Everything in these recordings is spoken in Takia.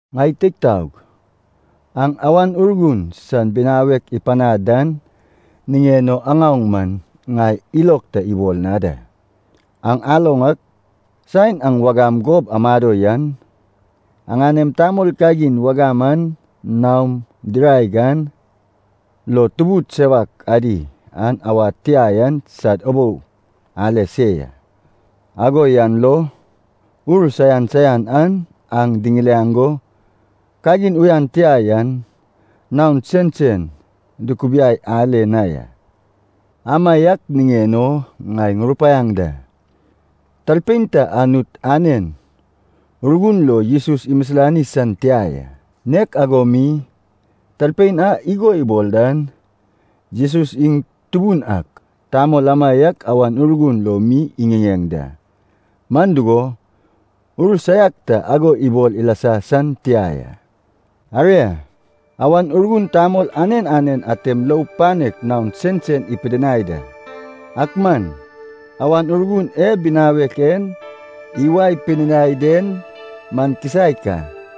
Ŋai teig taog, aŋ Awan Urgun san binawek ipanad dan niŋen o aŋaoŋ man ŋai ilog ta ibol na da. Aŋ aloŋ ak, saen aŋ wagam gob amado yan, aŋanem tamol kagin wagam an naom diraeg an lo tubud sewak adi a awad tia yan sad ubou ale se ya. Ago yan lo ur saian saian an aŋ diŋiliaŋ go kagin uyan tia yan naon sensen dukubiai ale na ya. Amaiak niŋen o ŋai ŋurupaiaŋ da. Talpein ta Anut anen Urgun lo Jesus imisilani san tia ya. Nek ago mi, talpein a igo ibol dan, “Jesus iŋ Tubun ak,” tamol amaiak Awan Urgun lo mi iŋiŋeŋ da. Man dugo, ur saiak ta ago ibol ilasa san tia ya. Aria, Awan Urgun tamol anen anen atem lou panek naon sensen ipidinai da. Ak man Awan Urgun e binawek en iwae pidinai den man kisaek a.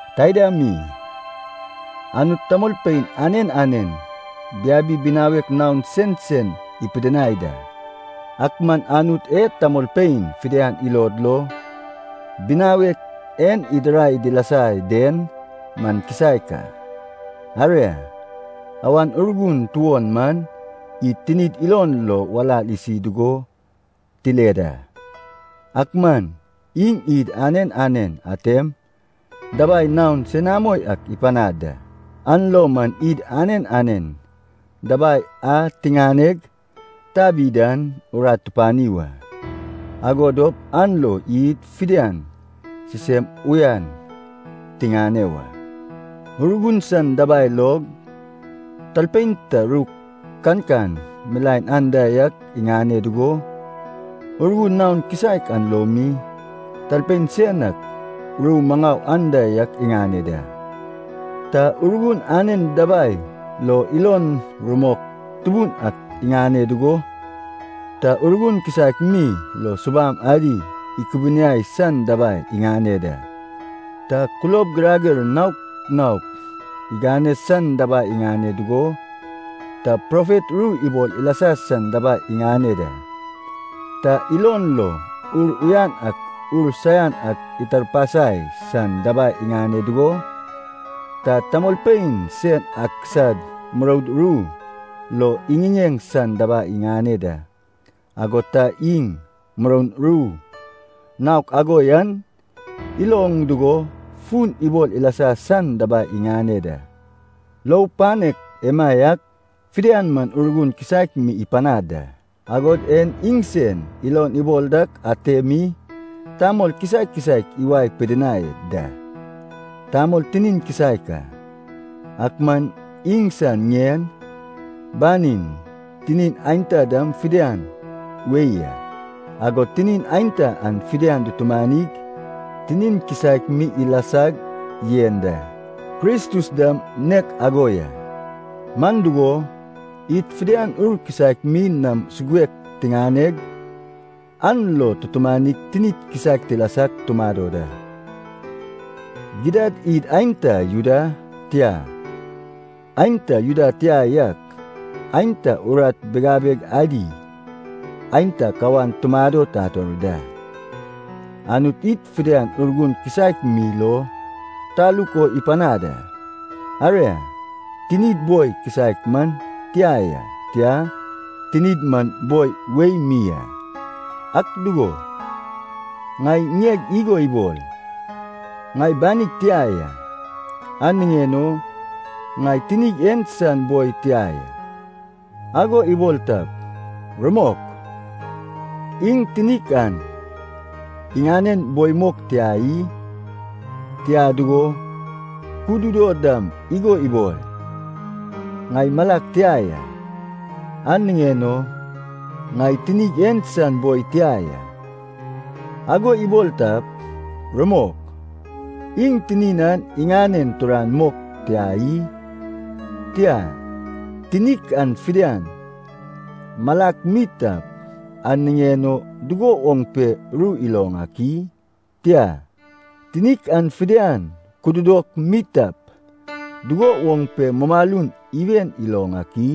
Taida mi, Anut tamolpein anen anen biabi binawek naon sensen ipidinai da, ak man Anut e tamolpein fidian ilod lo binawek en idirai dilasa den man kisaek a. Aria, Awan Urgun tuon man id tinid ilon lo walal isi dugo tile da. Ak man iŋ id anen anen atem dabai naon senamo ak ipanad da, an lo man id anen anen dabai a tiŋaneg tabi dan urat tupani wa, ago dop an lo id fidian sisem uyan tiŋane wa. Urgun san dabai log, talpein ta ru kankan milaen anda yak iŋane dugo, Urgun naon kisaek an lo mi, talpein sen ak ru maŋau anda yak iŋane da. Ta Urgun anen dabai lo ilo rumok tubun ak iŋane dugo, ta Urgun kisaek mi lo subam adi ikubuniai san dabai iŋane da. Ta kulob girager naok naok igane san dabai iŋane dugo, ta profet ru ibol ilasa san dabai iŋane da. Ta ilon lo ur uyan ak ur saian ak itarpasai san dabai iŋane dugo, ta tamolpein sen ak sad muroud ru lo iŋiŋeŋ san dabai iŋane da. Agod ta iŋ muroun ru naok ago yan iloŋ dugo fun ibol ilasa san dabai iŋane da. Lou panek emaiak fidian man Urgun kisaek mi ipanad da, agod en iŋsen ilon ibol dak ate mi tamol kisaek kisaek iwae pidinai da. Tamol tinin kisaek a, ak man iŋsan ŋien, banin, tinin aenta dam fidian wei a. Agod tinin aenta an fidian dutumanig tinin kisaek mi ilasag yen da. Kristus dam nek ago ya. Man dugo, id fidian Ur kisaek mi nam suguek tiŋaneg, an lo tutumanig tinik kisaek tilasag tumado da. Gidad id aenta Juda, tia, aenta Juda tia yak, aenta urat bigabeg adi, aenta kawan tumado tator da, Anut id fidian Urgun kisaek mi lo taluk o ipanad a. Aria, tinid boi kisaek man tia ya, tia, tinid man boi wei mi a. Ak dugo, ŋai ŋieg igo ibol, “Ŋai banig tia ya, an niŋen o ŋai tinig en san boi tia ya,” ago ibol tap, rumok, iŋ tinik an iŋanen boi mok tia i? Tia dugo, kududo dam igo ibol, “Ŋai malag tia ya, an niŋen o ŋai tinig en san boi tia ya,” ago ibol tap, rumok, iŋ tinin an iŋanen turan mok tia i? Tia, tinik an fidian malak mi tap, an niŋen o dugo woŋ ru iloŋ ak i? Tia, tinik an fidian kududok mi tap, dugo woŋ mumalun iwen iloŋ ak i?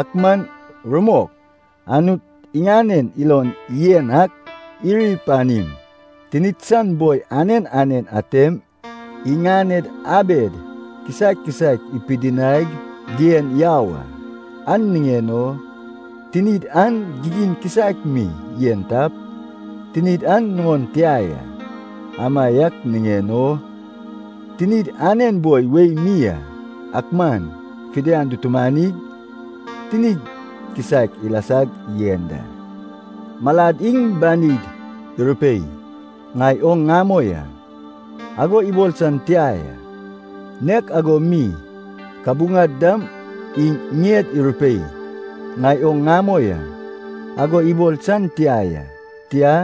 Ak man rumok, Anut iŋanen ilon yen ak iri panim, tinid san boi anen anen atem iŋaned abed kisaek kisaek ipidinaig dien yau a. An niŋen o tinid an gigin kisaek mi yen tap, tinid an nuŋon tia ya. Amaiak niŋen o tinid anen boi wei mi a, ak man fidian dutumanig tinid kisaek ilasag yen da. Malad iŋ banid irupei, “Ŋai oŋ ŋamoi a,” ago ibol san tia ya. Nek ago mi kabuŋad dam iŋ ŋied irupei, “Ŋai oŋ ŋamoi a,” ago ibol san tia ya. Tia,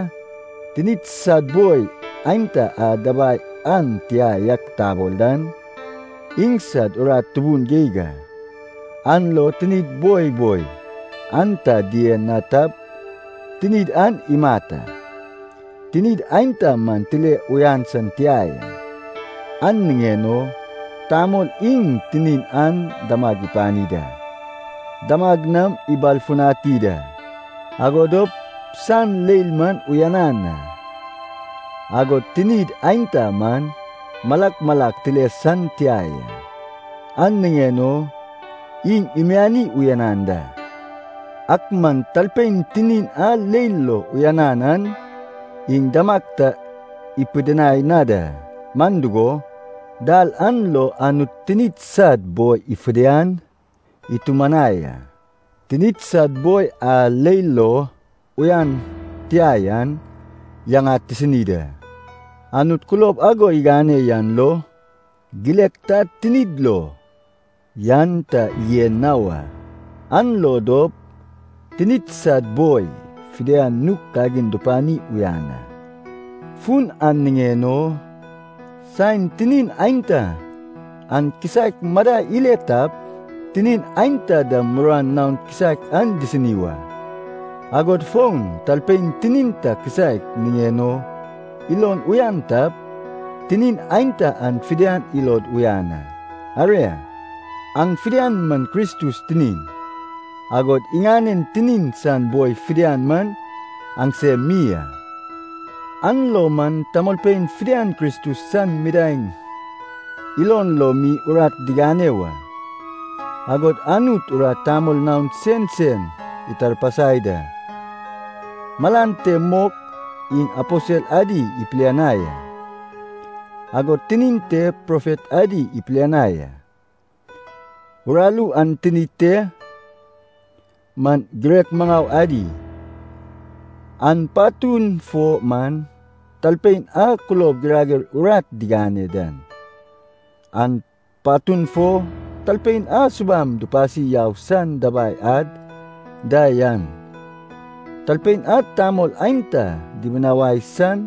tinid sad boi aenta a dabai an tia yak tabol dan, iŋsad urat tubun geig a, an lo tinid boi boi an ta dien na tap, tinid an imat a. Tinid aenta man tile uyan san tia ya, an niŋen o tamol iŋ tinin an damag ipani da. Damag nam ibalfutani da, ago dop san leil man uyanan a. Agod tinid aenta man malak malak tile san tia ya, an niŋen o iŋ imiani uyanan da. Ak man talpein tinin a leil lo uyanan an iŋ damag ta ipidinai na da. Man dugo, dal an lo Anut tinid sad boi fidian itumanai a, tinid sad boi a leil lo uyan tia yan, yaŋad tisini da. Anut kulob ago igane yan lo, gilek ta tinid lo yan ta yen na wa, an lo dop tinid sad boi fidian nug kagin dupani uyan a. Fun an niŋen o saen tinin aenta an kisaek madai ile tap, tinin aenta dam muruan naon kisaek an disini wa. Agod fon talpein tinin ta kisaek niŋen o ilon uyan tap, tinin aenta an fidian ilod uyan a. Aria, aŋ fidian man Kristus tinin, agod iŋanen tinin san boi fidian man aŋsem mi a. An lo man tamolpein fidian Kristus san midaeŋ ilon lo mi urat digane wa. Agod Anut urat tamol naon sensen itarpasai da. Malan te mok iŋ aposel adi ipilianai a, agod tinin te profet adi ipilianai a. Uraru an tinin te man girek maŋau adi, an patun fo man talpein a kulob girager urat digane dan, an patun fo talpein a subam dupasi yau san dabai ad da yan, talpein a tamolpein aenta dibinawai san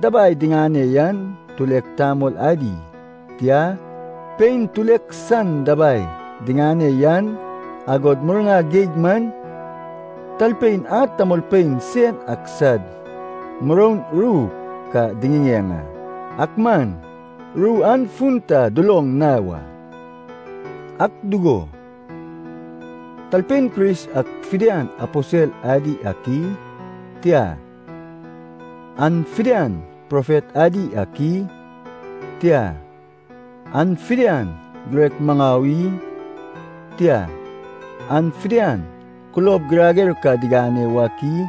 dabai diŋane yan, tulek tamol adi, tia, pein tulek san dabai diŋane yan, agod murna geig man, talpein a tamolpein sen ak sad muroun ru ka diŋiŋeŋ a, ak man ru an fun ta duloŋ na wa. Ak dugo, talpein Kris ak fidian aposel adi ak i? Tia, an fidian profet adi ak i? Tia, an fidian girek maŋau i? Tia, an fidian kulob girager ka digane wak i?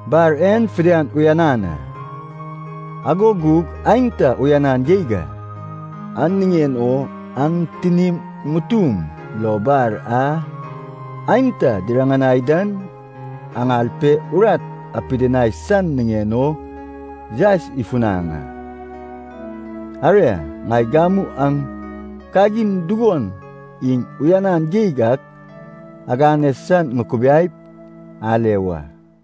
Bar en fidian uyanan a, ago gug aenta uyanan geig a. An niŋen o aŋ tinim ŋutum lo bar a aenta diriŋanai dan aŋal pe urat apidinai san niŋen o yaes ifunaŋ a. Aria, ŋai gamu aŋ kagin dugon iŋ uyanan geig ak agane san ŋukubiaip ale wa.